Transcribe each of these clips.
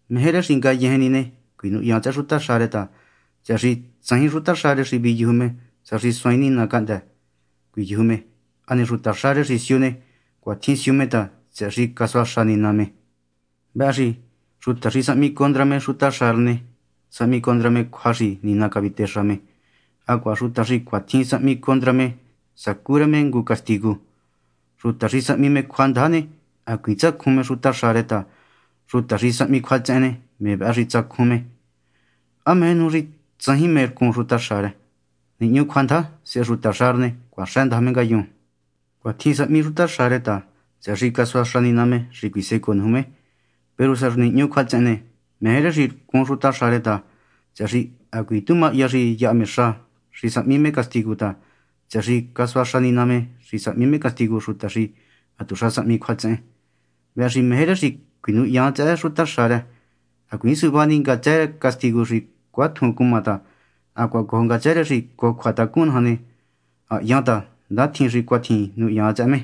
Meje rë xi ngayejen ni ne, cuinuhyan tsëhë xutaxa rë ta, tsëhë xi tsajin xutaxa rë xi viyuju me sa xi suaain Nina cahndë́ cuiyuju me. Hane xutaxa rë xi siu ne, cuatjin siu me ta, tsëhë xi casuaxa Nina me. Vëhë xi xuta xi sahmi condra me xutaxa rë ne, sahmi me condra cjua xi Nina cavitexa me. Hacuaha xuta xi cuatjin sahmi condra ne, sacú rë me ngu castigu. Xuta xi sahmi cjuandaja ne, hacuiin tsacjun me xutaxa rë ta xuta xi sahmi cjuatsehen ne, me vëhë xi tsacjun me. ¿Há meje nuju xi tsajin mé rcun xutaxa rë? Nihñu cjuandaja, sehe xutaxa rë ne, cuaxëndaja me ngayun. Cuatjin sahmi xutaxa rë ta, tsëhë xi casuaxa Nina me xi cuisecoo nuju me. Peru sa xi nihñu cjuatsehen ne, meje rë xi rcun xutaxa rë ta, tsëhë xi hacuiin tu mahya xi yaha me xa xi sahmi me castigu ta, tsëhë xi casuaxa Nina me xi sahmi me castigu xuta xi hatuxa sahmi cjuatsehen. Vëhë xi meje rë xi cuinuhyan tsëhë xutaxa rë, hacuiin suvá ni ngatsë rë castigu xi cuatjun cuma ta hacuaha cojo ngatsë rë xi cojo cjuatacun naja ne, ha hyan ta ndatjin xi cuatjin nuhyan tsëhë me.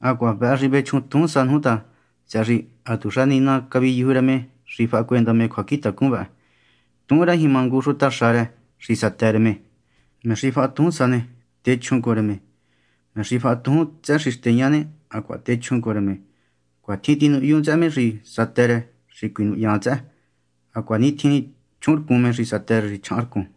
Hacuaha vëhë xi vechjun tujúnsa nuju ta, tsëhë xi hatuxa Nina caviyuju rë me xi fahacuenda me cjuacjintacun vë. Tuhun rë jima ngu xutaxa rë xi satë rë me. Me xi faha tujúnsa ne, techjun cojo rë me; me xi faha tujún tsëhë xi xteña ne, hacuaha techjun cojo rë me. Cuatjin tinuhyun tsëhë me xi satë rë xi cuinuhyan tsëhë, hacuanitjin chjuhunrcun me xi satë rë xi chjahanrcun.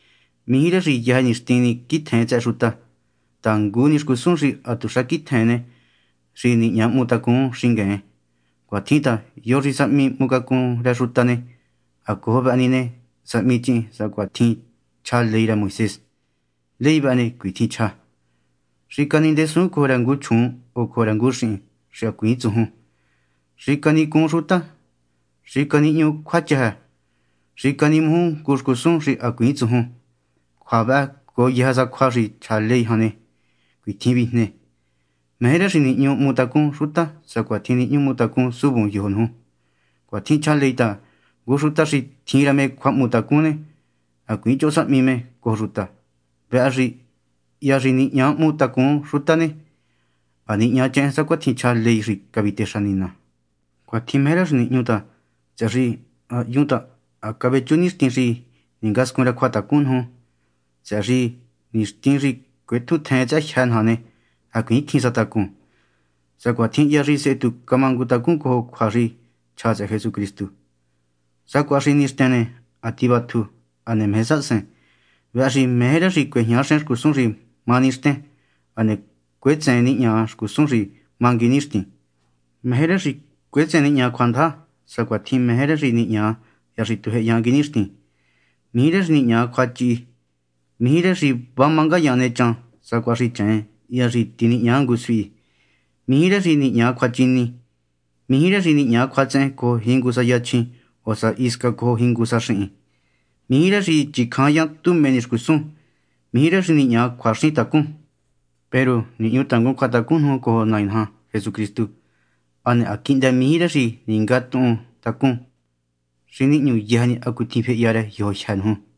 Mijí rë xi yëjë ni nixtin quitjun tsëhë xuta, ta ngu ni xcusun xi hatuxa quitjen ne, xi nihña hmu tacun xingueen. Cuatjin ta, yo xi sahmi hmu cacun rë xuta ne, ha cojo vëhë ni ne, sahmichihin sacuatjin chja ley rë Moisés. Ley vëhë ne, cuitjin chja: “Xicanindesuun cojo rë ngu chjuun o cojo rë ngu xihin xi hacuiin tsujun, xicanicuun xuta, xicanihñuu cjuachëjë, xicanimuju ngu xcusun xi hacuiin tsujun.” Cjua vëhë cojo yëjë sa cjua xi chja ley jan ne, cuitjin vijne: “Meje rë xi nihñu hmu tacún xuta sacuatjin nihñu hmu tacún suvun yojo nuju.” Cuatjin chja ley ta, ngu xuta xi tjin rë me cjuahmutacun ne, hacuiin choho sahmi me cojo xuta. Vëhë xi hya xi nihña hmu tacun xuta ne, ha nihñachehen sacuatjin chja ley xi cavitexa Nina. Cuatjin meje rë xi nihñu ta, tsëhë xi ha hyun ta ha cavechú nixtin xi ningascun rë cjuatacun nuju ta, tsëhë xi nixtin xi cuetjutjen tsëhë jyë́ naja ne, hacuiin cjin sa tacun, sacuatjin hya xi sehe tu camangutacun cojo cjua xi chja tsëhë Jesucristu. Sacuaha xi nixten ne, ha tivatju, hane meje sahasen. Vëhë xi meje rë xi cuejñaxen xcusun xi má nixten, hane cuetseen nihña xcusun xi má nguinixtin. Meje rë xi cuetseen nihña cjuandaja, sacuatjin meje rë xi nihña hya xi tujyehenyan nguinixtin. Mijí rë xi nihña cjuachihi, mijí rë xi va má ngayaan nechan sacuaha xi cheen hya xi tinihña ngu suhi, mijí rë xi nihña cjuachini, mijí rë xi nihña cjuatsehen cojo jingu sa yachjin, o sa xi hisca cojo jingu sa xihin, mijí rë xi chicjanyan tu mé ni xcusun, mijí rë xi nihña cjuaxintacun. Peru nihñu tangun cjuatacun nuju cojo Nai naja Jesucristu, hane ha quihndë mijí rë xi ningatuhuntacun xi nihñu yëjë ni hacutjin fehya yojo jyë́ nuju.